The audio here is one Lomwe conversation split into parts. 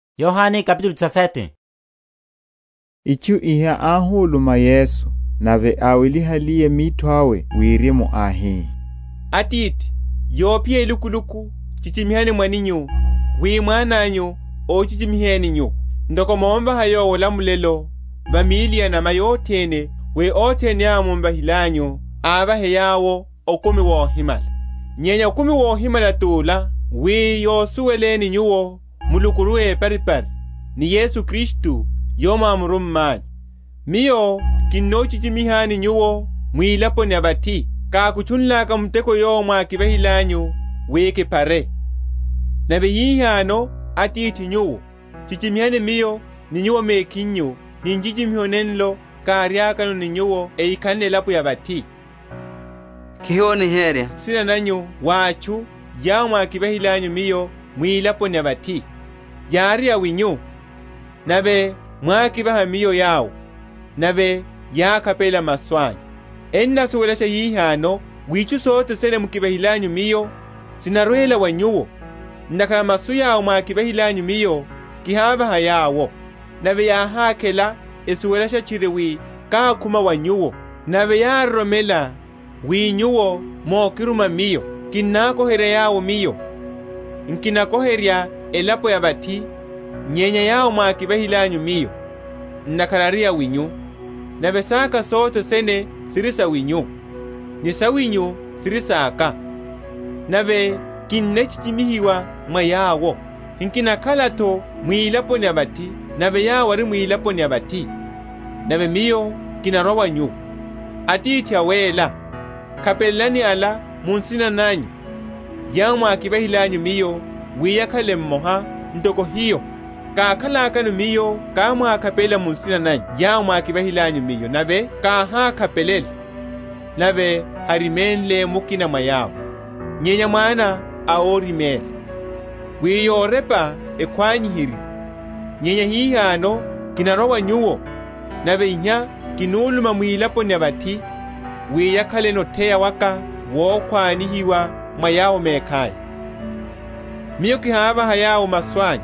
Ovekeleliwa wa óhuserya. Itchu iha áhuluma Yesu; nave áwelihaliye mitho awe wirimu, áhi, Atithi, yophiya elukuluku; chichimihani mwananyu, wi mwananyu ochichimiheni Nyuwo: ntoko momvaha Yowo olamulelo va míli ya’nama yothene, wi othene yawo mumvahilanyu, ávahe yawo okumi wohimala. Nyenya okumi wohimala ti ola, wi yasuwele Nyuwo Mulukuru éparipari, ni Yesu Kristu yowo mwámurummanyu. Miyo kihochichimihani Nyuwo mwilaponi ya vathi, kákutchunlaka muteko yowo mwákivahilanyu wi kiphare. Nave hihano, Atithi Nyuwo, chichimihani Miyo ni Nyuwo mekhinyu ni nchichimiho nenlo káriakano ni Nyuwo ehikhanle elapo ya vathi. Kihoniherya nsina nanyu wa atchu yawo mukivahilanyu Miyo mwilaponi ya vathi: yári awinyu, nave mwákivaha Miyo yawo; nave yákhapelela masu anyu. Ennasuwelasha hihano wi itchu sothe sene mukivahilanyu Miyo sinarwela wa Nyuwo; ntakhara masu yawo mwákivahilanyu Miyo kihávaha yawo; nave yáhákhela, esuwelasha tchiri wi kákhuma wa Nyuwo, nave yároromela wi Nyuwo mokiruma Miyo. Kinnakoherya yawo Miyo: nkinakoherya elapo ya vathi, nyenya yawo mwákivahilanyu Miyo, ntakhara ari awinyu: nave saka sothe sene siri sawinyu, ni sawinyu siri saka; nave kinnachichimihiwa mwa yawo. Nkinakhala’tho mwilaponi ya vathi, nave yawo ari mwilaponi ya vathi, nave Miyo kinarwa wa Nyuwo. Atithi Awéla, khapelelani ala mu nsina nanyu yawo mukivahilanyu Miyo, wi yakhale mmoha, ntoko hiyo. Kákhalakano Miyo kámwakhapelela mu nsina nanyu yawo mwákivahilanyu Miyo; nave káhákhapelela, nave háriménle mukina mwa yawo, nyenya mwana a oriméla, wi yorepa ekhwanihiwe. Nyenya hihano kinarwa wa Nyuwo; nave iha kinuluma mwilaponi ya vathi, wi yakhaleno otheya waka wokhwanihiwa mwa yawo mekhaya. Miyo kihavaha yawo masu anyu;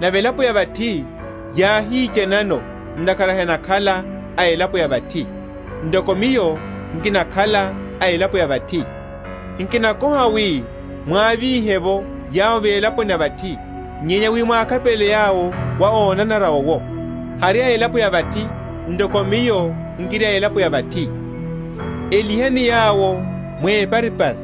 nave elapo ya vathi yáhichanano, ntakhara henakhala a elapo ya vathi, ntoko Miyo nkinakhala a elapo ya vathi. Nkinakoha wi mwavíhe’vo yawo mwilaponi ya vathi, nyenya wi mwakhapelele yawo wa ónanara owo. Hari a elapo ya vathi ntoko Miyo nkiri a elapo ya vathi. Elihani yawo mwiparipari;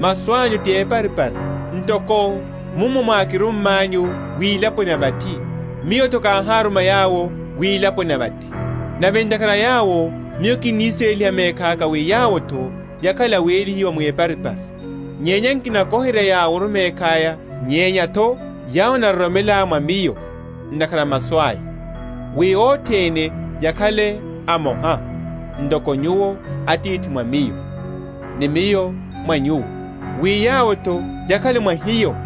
masu anyu ti eparipari. Ntoko mummo mwákirummanyu wilaponi ya vathi, Miyo’tho káháruma yawo wilaponi ya vathi. Nave ntakhara a yawo Miyo kinniséliha mekhaka wi yawo’tho yakhale awélihiwa mwiparipari. Nyenya nkinakoherya yaworu mekhaya, nyenya’tho yawo enaroromela mwa Miyo ntakhara a masu aya; wi othene yakhale amoha, ntoko Nyuwo Atithi mwa Miyo, ni Miyo mwa Nyuwo, wi yawo’tho yakhale mwa hiyo: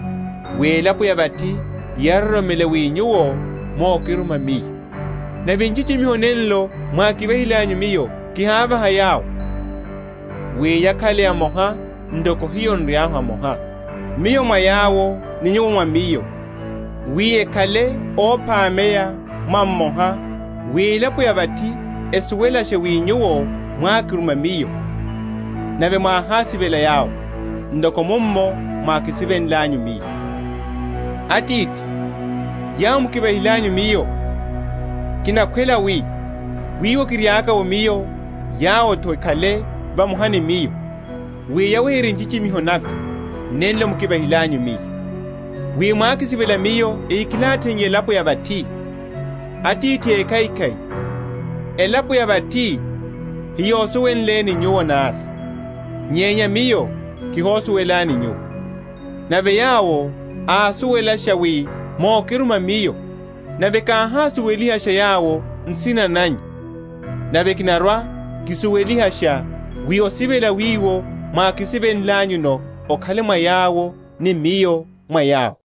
wi elapo ya vathi yaroromele wi Nyuwo mokiruma Miyo. Nave nchichimiho nenlo mwákivahilanyu Miyo kihávaha yawo; wi yakhale amoha, ntoko hiyo n’ri mmoha; Miyo mwa yawo, ni Nyuwo mwa Miyo, wi ekhale óphameya mwa mmoha; wi elapo ya vathi esuwelashe wi Nyuwo mwákiruma Miyo, nave mwáhásivela yawo, ntoko mummo mukisivelenlanyu Miyo. Atithi, yawo mukivahilanyu Miyo, kinakhwela wi, wiwo kiriaka’wo Miyo, yawo’tho ekhale vamoha ni Miyo; wi yaweherye nchichimiho naka, nenlo mukivahilanyu Miyo: wi mwákisivela Miyo ehikilatheiye elapo ya vathi. Atithi ékhaikhai, elapo ya vathi heyosuwenleni Nyuwo nari, nyenya Miyo kihosuwelani Nyuwo; nave yawo ásuwelasha wi mokiruma Miyo; nave káhásuwelihasha yawo nsina nanyu, nave kinarwa‐kisuwelihasha; wi osivela wiwo mwákisivenlanyuno okhale mwa yawo, ni Miyo mwa yawo.